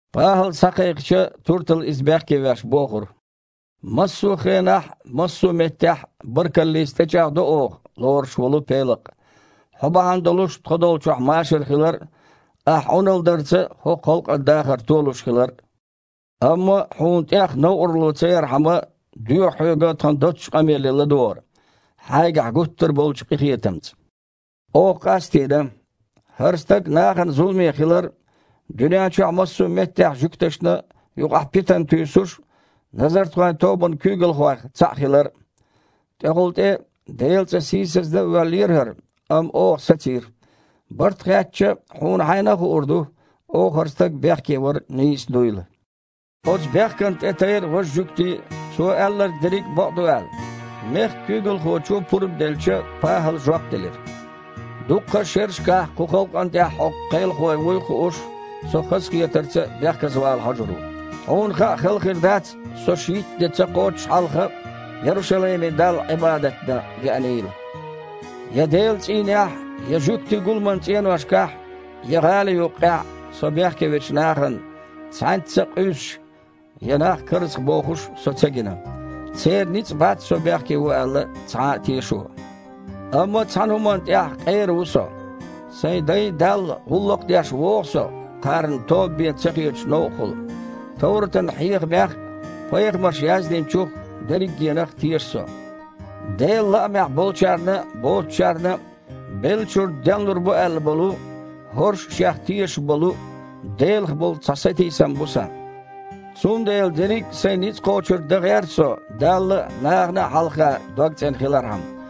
ПахІал схьакхайкхича, Туртала, иза бехкевеш, бохура: «Массо а хенахь а, массо а меттехь а баркаллица тІечІагІдо оха, лоруш волу Пелакъ, хьо бахьана долуш тхо долчохь машар хилар а, ахь Іуналла дарца хІокху халкъан дахар толуш хилар а. Амма, хьуна тІех новкъарло ца ярхьама, доьху хьоьга тхан доццачу къамеле ладогІар, хьайгахь гуттар а болчу къинхетамца. Оха къастийна: хІара стаг нахана зуламе хилар, дуьнен чохь массо а меттехь жуьгташна юкъахь питана туьйсуш а, назартхойн тобанан куьйгалхойх цхьаъ хилар а. ТІехула тІе Делан цІа сийсаздан а воьллера хІара, амма оха сацийра. Барт хаьттича, хьуна хьайна а хуур ду, оха хІара стаг бехкевар нийса дуйла». Оцу бехкана тІетайра важа жуьгтий а, цо аьлларг дерриг а бакъ ду аьлла. Мехкан куьйгалхочо пурба делча, ПахІала жоп делира: «Дуккха а шерашкахь кху халкъана тІехь хьо кхелахо вуй а хууш, со хазахетарца бехказавала хьожур ву. Хьуна хаа хала хир дац, со шийтта де ца кхоччуш хьалха Ярушалайме Далла Іибадат дан веанийла. Я Делан цІийнехь а, я жуьгтийн гуламан цІеношкахь а, я гІали юккъехь а со бехке вечу нахана цхьаьнцца а къуьйсуш я нах карзахбохуш а со ца гина. Церан ницкъ бац, со бехке ву аьлла, цхьа а тешо. Амма цхьана хІуманна тІехь къера ву со: сайн дайн Далла гІуллакх деш вогІу со кхарна тоба бен ца хетачу новкъахула. Товратан хьехамех а, пайхамарша яздинчух а – дерригенах а теша со. Делан лаамехь болчарна а, боцучарна а беллачуьра денлур бу аьлла болу, хІорш а шех тешаш болу, Делах болу цхьа сатийсам бу сан. Цундела дерриг а сайн ницкъ кхочург дан гІерта со Далла а, нахана а хьалха догцІена хилархьама.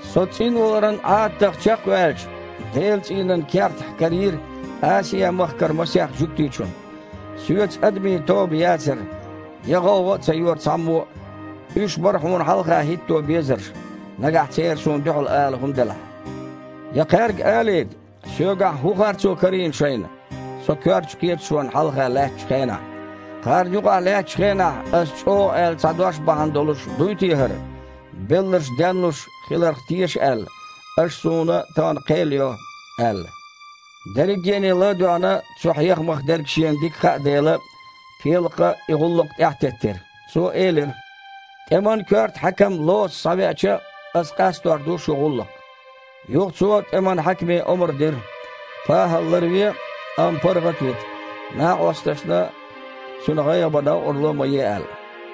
Со цІинваларан Іадатах чекхваьлча, Делан цІийнан кертахь карийра Асиа-махкара масех жуьгтичунна. Соьца адамийн тоба яцара, я гІовгІа а ца йора цхьаммо а. Уьш бара хьуна хьалха хІитто безарш, нагахь церан суна дуьхьал ала хІума делахь. Я кхаьрга алийта, соьгахь хІун харцо карийна шайна, со коьртачу кхеташонна хьалха лаьттачу хенахь. Кхарна юкъахь лаьттачу хенахь ас чІогІа аьлла цхьа дош бахьана долуш дуй те хІара: „Белларш денлуш хиларх теша аьлла, аша суна тахана кхел йо“, – аьлла». Дерригене ла а доьгІна, цу хьехамах дерг шена дика хаьа дела, Пелакъа и гІуллакх тІаьхьатеттира. Цо элира: «ТІеман коьрта хьаькам Лоса схьавеача, ас къастор ду шун гІуллакх». Юха цо тІеман хьаькаме омра дира, ПахІал ларве, амма паргІат а вита, накъосташна цуьнан гІайгІа бан новкъарло а ма е аьлла.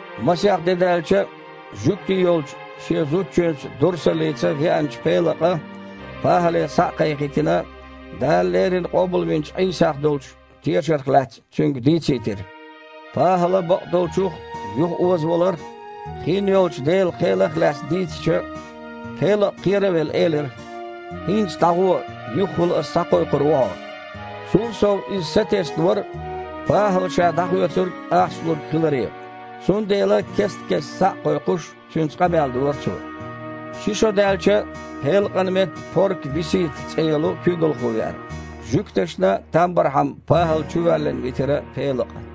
Масех де даьлча, жуьгти йолчу, шен зудчуьнца Дурсалица веанчу Пелакъа, ПахІале схьа а кхайкхийтина, Дала леррина къобалвинчу Іийсах долчу тешарх лаьцна цуьнга дийцийтира. ПахІала бакъдолчух а, юхаозаваларх а, хин йолчу Делан кхелах а лаьцна дийцича, Пелакъа, кхера а велла, элира: «ХІинца дІагІо, юхахула ас схьакхойкхур ву хьо». Цул сов иза сатесна вара ПахІала ша дІахоьцург ахча лург хиларе, цундела, кест-кеста схьа а кхойкхуш, цуьнца къамел дора цо. Ши шо даьлча, Пелакъан метта Порка Висита цІе йолу куьйгалхо веара. Жуьгташна там бархьама ПахІал чувоьллина витира Пелакъа.